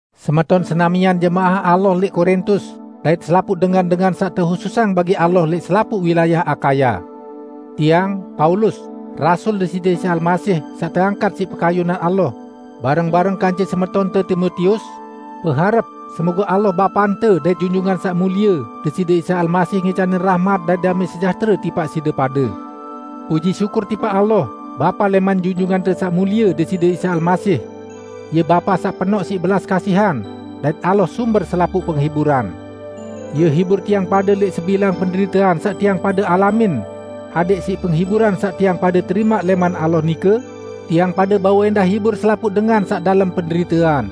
Semeton senamian jemaah Allah lẽq Korintus dait selapuq dengan-dengan saq tehususang bagi Allah lẽq selapuq wilayah Akaya. Tiang, Paulus, rasul Deside Isa Almasih, saq teangkat siq pekayunan Allah, bareng-bareng kance semetonte Timotius, beharep semoge Allah Bapante dait Junjungan Saq Mulie, Deside Isa Almasih ngicanin rahmat dait damẽ sejahtere tipaq side pade. Puji syukur tipaq Allah, Bapa lẽman Junjungante Saq Mulie, Deside Isa Almasih. Ie Bapa saq penoq siq belas kasihan, dait Allah sumber selapuq penghiburan. Ie hibur tiang pade lẽq sebilang penderitean saq tiang pade alamin, adẽq siq penghiburan saq tiang pade terimaq lẽman Allah nike, tiang pade bau ẽndah hibur selapuq dengan saq dalem penderitean.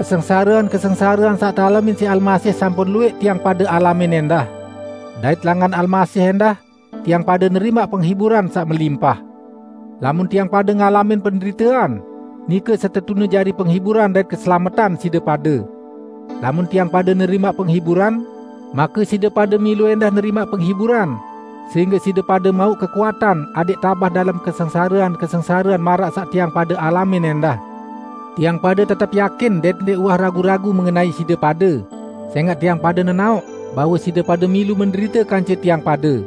Kesengsarean-kesengsarean saq tealamin siq Almasih sampun luwẽq tiang pade alamin ẽndah. Dait langan Almasih ẽndah, tiang pade nerimaq penghiburan saq melimpah. Lamun tiang pade ngalamin penderitean, nike setetune jari penghiburan dait keselametan side pade. Lamun tiang pade nerimaq penghiburan, make side pade milu ẽndah nerimaq penghiburan sehingge side pade mauq kekuatan adẽq tabah dalem kesengsarean-kesengsarean maraq saq tiang pade alamin ẽndah. Tiang pade tetep yakin dait ndẽq uwah ragu-ragu mengenai side pade, sẽngaq tiang pade nenaoq bahwe side pade milu menderite kance tiang pade.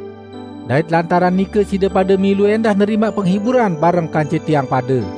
Dait lantaran nike side pade milu ẽndah nerimaq penghiburan bareng kance tiang pade.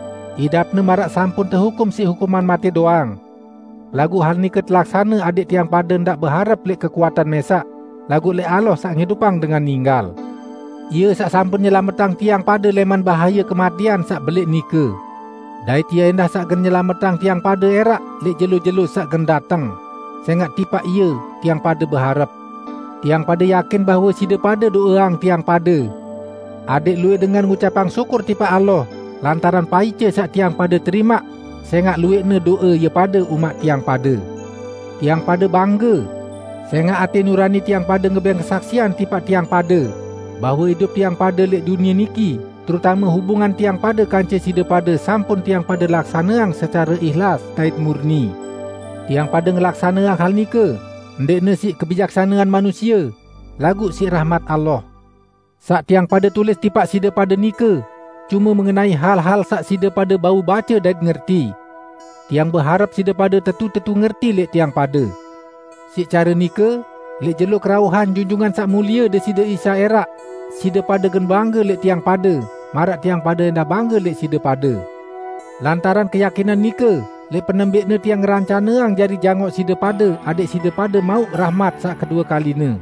idapne maraq sampun tehukum siq hukuman matẽ doang. Laguq hal nike telaksane adẽq tiang pade ndaq beharep lẽq kekuatan mẽsaq, laguq lẽq Allah saq ngidupang dengan ninggal. Ie saq sampun nyelametang tiang pade lẽman bahaye kematẽan saq belẽq nike. Dait Ie ẽndah saq gen nyelametang tiang pade ẽraq lẽq jelo-jelo saq gen dateng, sẽngaq tipaq Ie tiang pade beharep. Tiang pade yakin bahwe side pade do'eang tiang pade, adẽq luwẽq dengan ngucapang syukur tipaq Allah lantaran paice saq tiang pade terimaq sẽngaq luwẽqne do'e ie pade umaq tiang pade. Tiang pade bangge, sẽngaq atẽ nurani tiang pade ngebẽng kesaksian tipaq tiang pade bahwe idup tiang pade lẽq dunie niki -- terutame hubungan tiang pade kance side pade sampun tiang pade laksaneang secare ihlas dait murni. Tiang pade ngelaksaneang hal nike, ndẽqne siq kebijaksanean manusie, laguq siq rahmat Allah. Saq tiang pade tulis tipaq side pade nike cume mengenai hal-hal saq side pade bau bace dait ngerti. Tiang beharep side pade tetu-tetu ngerti lẽq tiang pade. Siq care nike, lẽq jelo kerauhan Junjungan Saq Mulie Deside Isa ẽraq, side pade gen bangge lẽq tiang pade, maraq tiang pade ẽndah bangge lẽq side pade. Lantaran keyakinan nike lẽq penembẽqne tiang ngerencaneang jari jangoq side pade adẽq side pade mauq rahmat saq kedue kaline.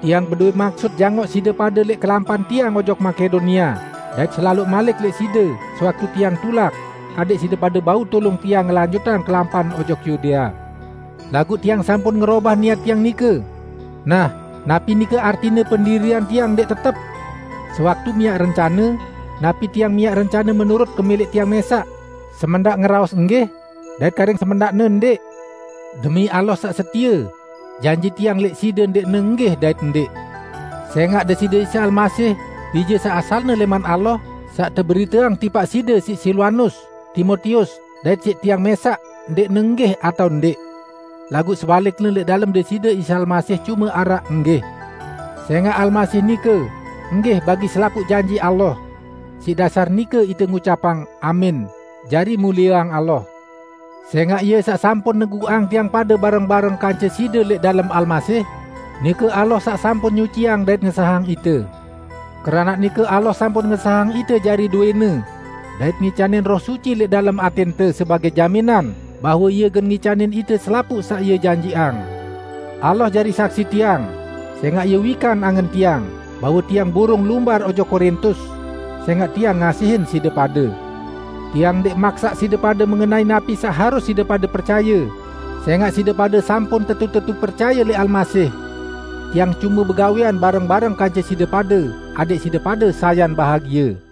Tiang bedowẽ maksut jangoq side pade lẽq kelampan tiang ojok Makedonia, dait selaloq malik lẽq side sewaktu tiang tulak, adẽq side pade bau tulung tiang ngelanjutang kelampan ojok Yudea. Laguq tiang sampun ngerobah niat tiang nike; nah, napi nike artine pendirian tiang ndẽq tetep? Sewaktu miaq rencane, napi tiang miaq rencane menurut kemẽlẽq tiang mẽsaq, semendaq ngeraos, "Enggih" dait karing semendaqne "Ndẽq"? Demi Allah saq setie, janji tiang lẽq side ndẽqne "Enggih" dait "Ndẽq". Sẽngaq Deside Isa Almasih, Bije saq asalne lẽman Allah, saq teberiteang tipaq side siq Silwanus, Timotius, dait siq tiang mẽsaq ndẽqne "Enggih" atao "Ndẽq". Laguq sebalikne lẽq dalem Deside Isa Almasih cume araq "Enggih". Sẽngaq Almasih nike "Enggih" bagi selapuq janji Allah. Siq dasar nike ite ngucapang "Amin" jari mulieang Allah. Sẽngaq Ie saq sampun neguqang tiang pade bareng-bareng kance side lẽq dalem Almasih, nike Allah saq sampun nyuciang dait ngesahang ite. Keranaq nike Allah sampun ngesahang ite jari dowẽ-Ne, dait ngicanin Roh Suci lẽq dalem atẽnte sebagẽ jaminan bahwe Ie gen ngicanin ite selapuq saq Ie janjiqang. Allah jari saksi tiang -- sẽngaq Ie wikan angen tiang -- bahwe tiang burung lumbar ojok Korintus, sẽngaq tiang ngasihin side pade. Tiang ndẽq maksaq side pade mengenai napi saq harus side pade percaye, sẽngaq side pade sampun tetu-tetu percaye lẽq Almasih. Tiang cume begawẽan bareng-bareng kance side pade adẽq side pade sayan bahagie.